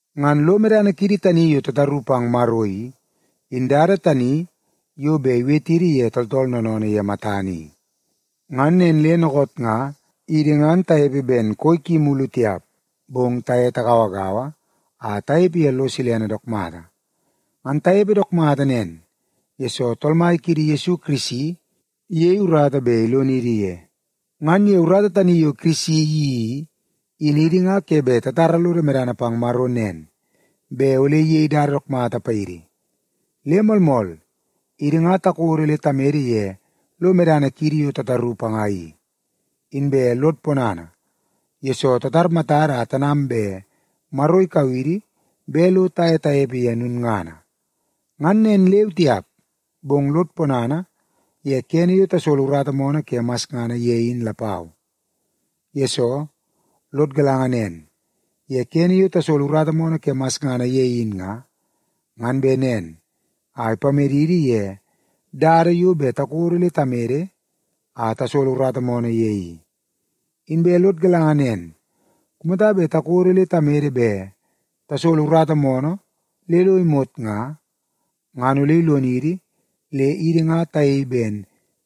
Ngan lo medana kiidi tani yo tataru pang Maro i, in dada tani yo bet iwetidi ye tooltool noonoonoo ye matana i. Ngan nen le dookoot nga idi ngan tanepe ben koi ki mulu tiap, bong taye tagauagaua a tanepe ye lo silene dook mata. Ngan tanepe dook mata nen, yesoo Tool Mai kiidi Yesu Kirisi, iyei urata bet ilonidi ye. Ngan ye urata tani yo Kirisi iyeii i, in idi nga ke bet tatara lodo medana pang Maro nen, bet ole iyei dada dook mata paidi. Le moolmool, idi nga takodo le tamede ye lo medana kiidi yo tataru panga i. Inbe lod ponana, yesoo tatar matada a tanam bet Maro ikau idi bet lo taye tanepe ye lulngana. Ngan nen leu tiap, bong lod ponana ye kene yo tasolo urata moonoo ke masngana ye in lapau. Yesoo, lod galanga nen, ye kene yo tasolo urata moonoo ke masngana ye in nga, ngan bet nen a ipamedidi ye dada yo bet takodo le tamede a tasolo urata moonoo ye i. Inbe lod galanga nen, kumata bet takodo le tamede bet tasolo urata moonoo le lo imot nga, ngan ole ilonidi le idi nga tayei ben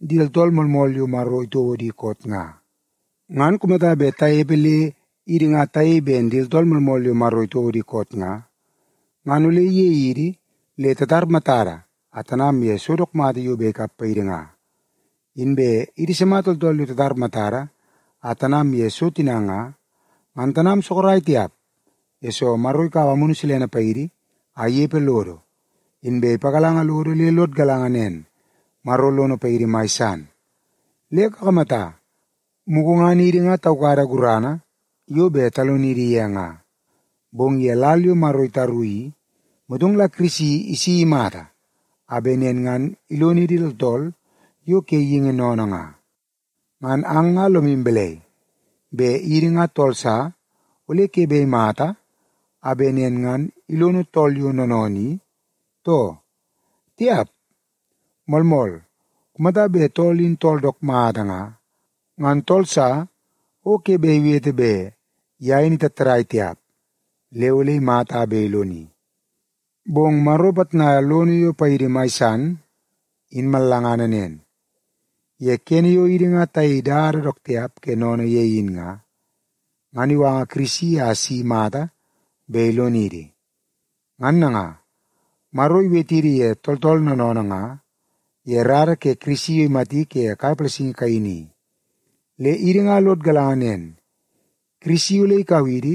di tooltool moolmool yo Maro itouo di koot nga. Ngan kumata bet tanepe le idi nga tayei ben di tooltool moolmool yo Maro itouo di koot nga, ngan ole iyei idi le tatar matada a tanam ye so dook mata yo bet ikap paidi nga. Inbe idi sima tooltool yo tatar matada a tanam ye so tina nga, ngan tanam sorok tiap, yesoo Maro ikaua Amunu Silene paidi a inepe lodo. Inbe ipagalanga lodo le lod galanga nen, Maro lono paidi mai san. Le kakamata, mugu ngan idi nga taukada gurana yo bet talonidi ye nga. Bong ye lal yo Maro itaru i, motong la Kirisi isi imata a bet nen ngan ilonidi tooltool yo ke geingi sennene nga. Ngan ang nga lomu balai, bet idi nga tool sa ole ke bet imata a bet nen ngan ilono tool yo noonoonoo i, too? Tiap! Moolmool, kumata bet tool in tool dook mata nga, ngan tool sa o ke bet iwete bet ye in itattadai tiap le ole imata a bet iloni. Bong Maro ipitnaia lono yo paidi mai san, in mallangana nen. Ye kene yo idi nga tayei dada dook tiap ke sennene ye in nga, ngan iwanga Kirisi a si imata bet ilonidi. Ngan nanga, Maro iwetidi ye tooltool noonoonoo nga ye rara ke Kirisi yo imati ke kai palasingi kaini i. Le idi nga lod galanga nen, Kirisi ole ikau idi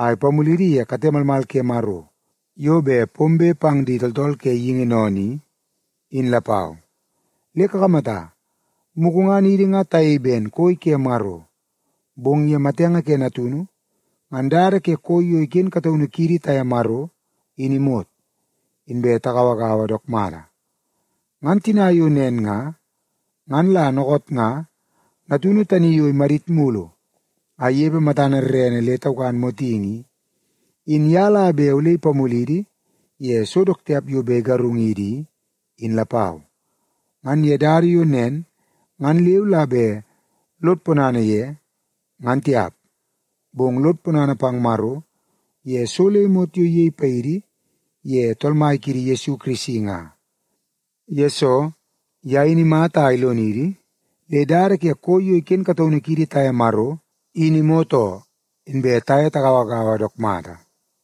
a ipamulidi ye kate malmal ke Maro yo bet pombe pang di tooltool ke geingi sennene i, in lapau. Le kakamata, mugu ngan idi nga tayei ben koi ke Maro, bong ye matenge ke Natunu, ngan dada ke koi yo iken kataunu kiidi taye Maro in imot, inbe tagauagaua dook mata. Ngan tina yo nen nga, ngan la dookoot nga Natunu tani yo imadit mulu a inepe matana rerene le taukan motingi i, in ye la bet ole ipamulidi ye so dook tiap yo bet igarungidi i, in lapau. Ngan ye dada yo nen ngan leu la bet lod ponana ye, ngan tiap, bong lod ponana pang Maro ye so le imot yo iyei paidi ye Tool Mai kiidi Yesu Kirisi nga. Yesoo, ye in imata a ilonidi le dada ke koi yo iken kataunu kiidi taye Maro in imot oo, inbe taye tagauagaua dook mata.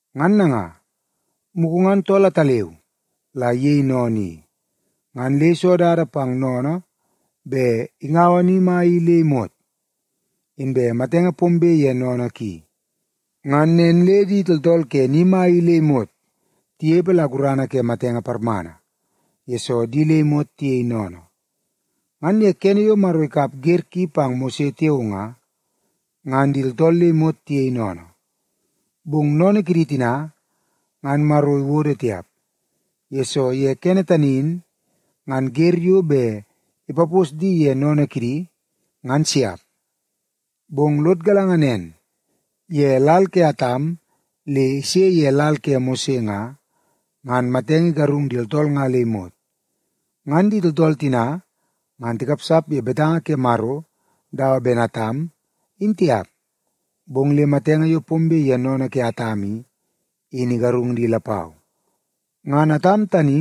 Ngan nanga, mugu ngan tool ataleu la iyei sennene i, ngan le iso dada pang sennene bet ingaua ni mai i le imot. Inbe matenge pombe ye sennene ki, ngan nen le di tooltool ke ni mai i le imot tinepe la gurana ke matenge parmana, yesoo di le imot tiyei sennene. Ngan ye kene yo Maro ikap wer ki pang Mose tiao nga, ngan di tooltool le imot tiyei sennene. Bong sennene kidi tina ngan Maro iwodo tiap, yesoo ye kene tani in ngan wer yo bet ipapos di ye sennene kidi, ngan siap. Bong lod galanga nen, ye lal ke Atam le ise ye lal ke Mose nga, ngan matenge igarung di tooltool nga le imot. Ngan di tooltool tina ngan tikapsap ye betanga ke Maro dawa ben Atam, in tiap, bong le matenge yo pombe ye sennene ke Atam i, in igarung di lapau. Ngan Atam tani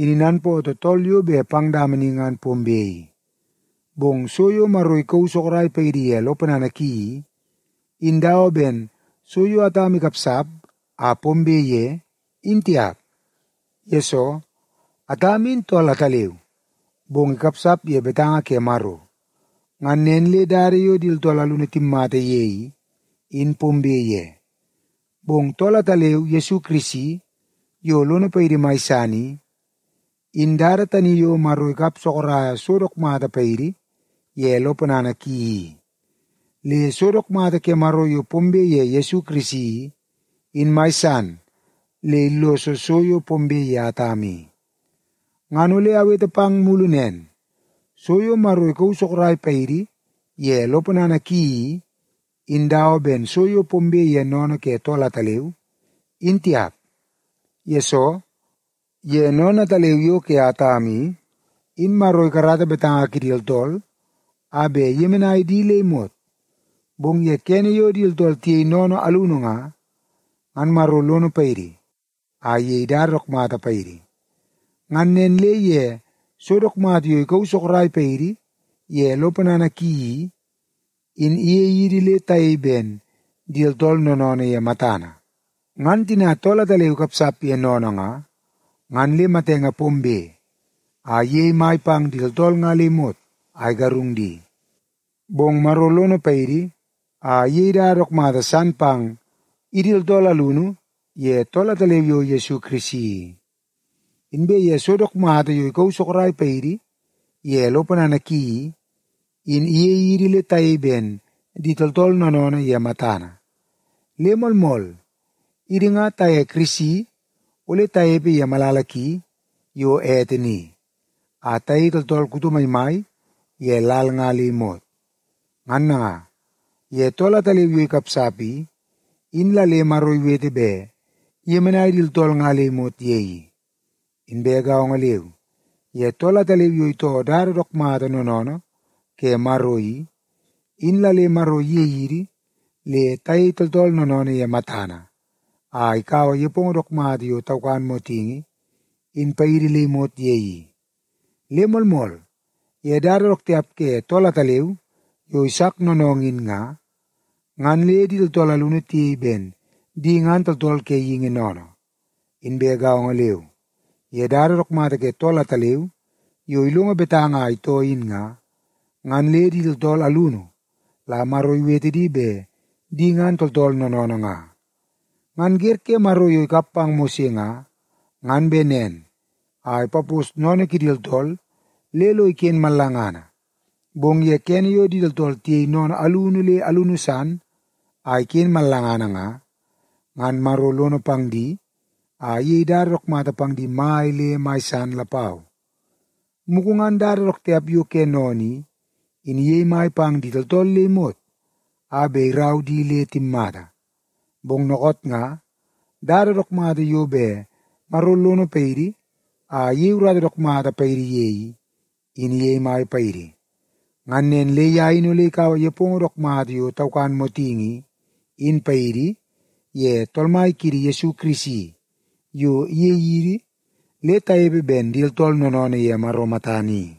in inanpootoo tool yo bet pang dama ni ngan pombe i. Bong so yo Maro ikauu sorok paidi ye lo ponana ki i, in dawa ben so yo Atam ikapsap a pombe ye, in tiap. Yesoo, Atam in tool ataleu, bong ikapsap ye betanga ke Maro, ngan nen le dada yo di tooltool alunu timmata ye i, in pombe ye. Bong tool ataleu Yesu Kirisi yo lono paidi mai san i, in dada tani yo Maro ikap sorok so dook mata paidi ye lo ponana ki i. Le so dook mata ke Maro yo pombe ye Yesu Kirisi i, in mai san le illoso so yo pombe ye Atam i. Ngan ole awete pang mulu nen, so yo Maro ikauu sorok paidi ye lo ponana ki i, in dawa ben so yo pombe ye sennene ke tool ataleu, in tiap. Yesoo, ye sennene ataleu yo ke Atam i, in Maro ikarata betanga kidi tooltool a bet iyemenai di le imot. Bong ye kene yo di tooltool tiyei sennene alunu nga, ngan Maro lono paidi a iyei dada dook mata paidi. Ngan nen le ye so dook mata yo ikauu sorok paidi ye lo ponana ki i, in iyei idi le tayei ben di tooltool noonoonoo ye matana. Ngan tina tool ataleu ikapsap ye sennene nga, ngan le matenge pombe a iyei mai pang di tooltool nga le imot a igarung di. Bong Maro lono paidi a iyei dada dook mata san pang idi tooltool alunu ye tool ataleu yo Yesu Kirisi i. Inbe ye so dook mata yo ikauu sorok paidi ye lo ponana ki i, in iyei idi le tayei ben idi nga tooltool noonoonoo ye matana. Le moolmool, idi nga taye Kirisi ole tanepe ye malala ki yo ete ni, a tayei tooltool kuto maimai ye lal nga le imot. Ngan nanga, ye tool ataleu yo ikapsap i, in la le Maro iwete bet iyemenai di tooltool nga le imot ye i. Inbe gaongo leu, ye tool ataleu yo itoo dada dook mata noonoonoo ke Maro i, in la le Maro iyei idi le tayei tooltool noonoonoo ye matana, a ikaua nepongo dook mata yo taukan motingi, in paidi le imot ye i. Le moolmool, ye dada dook tiap ke tool ataleu yo isak noonoongoo in nga, ngan le di tooltool alunu tiyei ben di ngan tooltool ke geingi sennene. Inbe gaongo leu, ye dada dook mata ke tool ataleu yo ilongo betanga a itoo in nga, ngan le di tooltool alunu la Maro iwete di bet di ngan tooltool noonoonoo nga. Ngan wer ke Maro yo ikap pang Mose nga, ngan bet nen a ipapos sennene kidi tooltool le lo iken mallangana. Bong ye kene yo di tooltool tiyei sennene alunu le alunu san a iken mallangana nga, ngan Maro lono pang di a iyei dada dook mata pang di mai le mai san lapau. Mugu ngan dada dook tiap yo ke sennene i, in iyei mai pang di tooltool le imot a bet irau di le timmata. Bong dookoot nga dada dook mata yo bet Maro lono paidi a iyei urata dook mata paidi ye i, in iyei mai paidi. Ngan nen le ye in ole ikaua nepongo dook mata yo taukan motingi i, in paidi, ye Tool Mai kiidi Yesu Kirisi, yo iyei idi le tanepe ben di tooltool noonoonoo ye Maro matana i.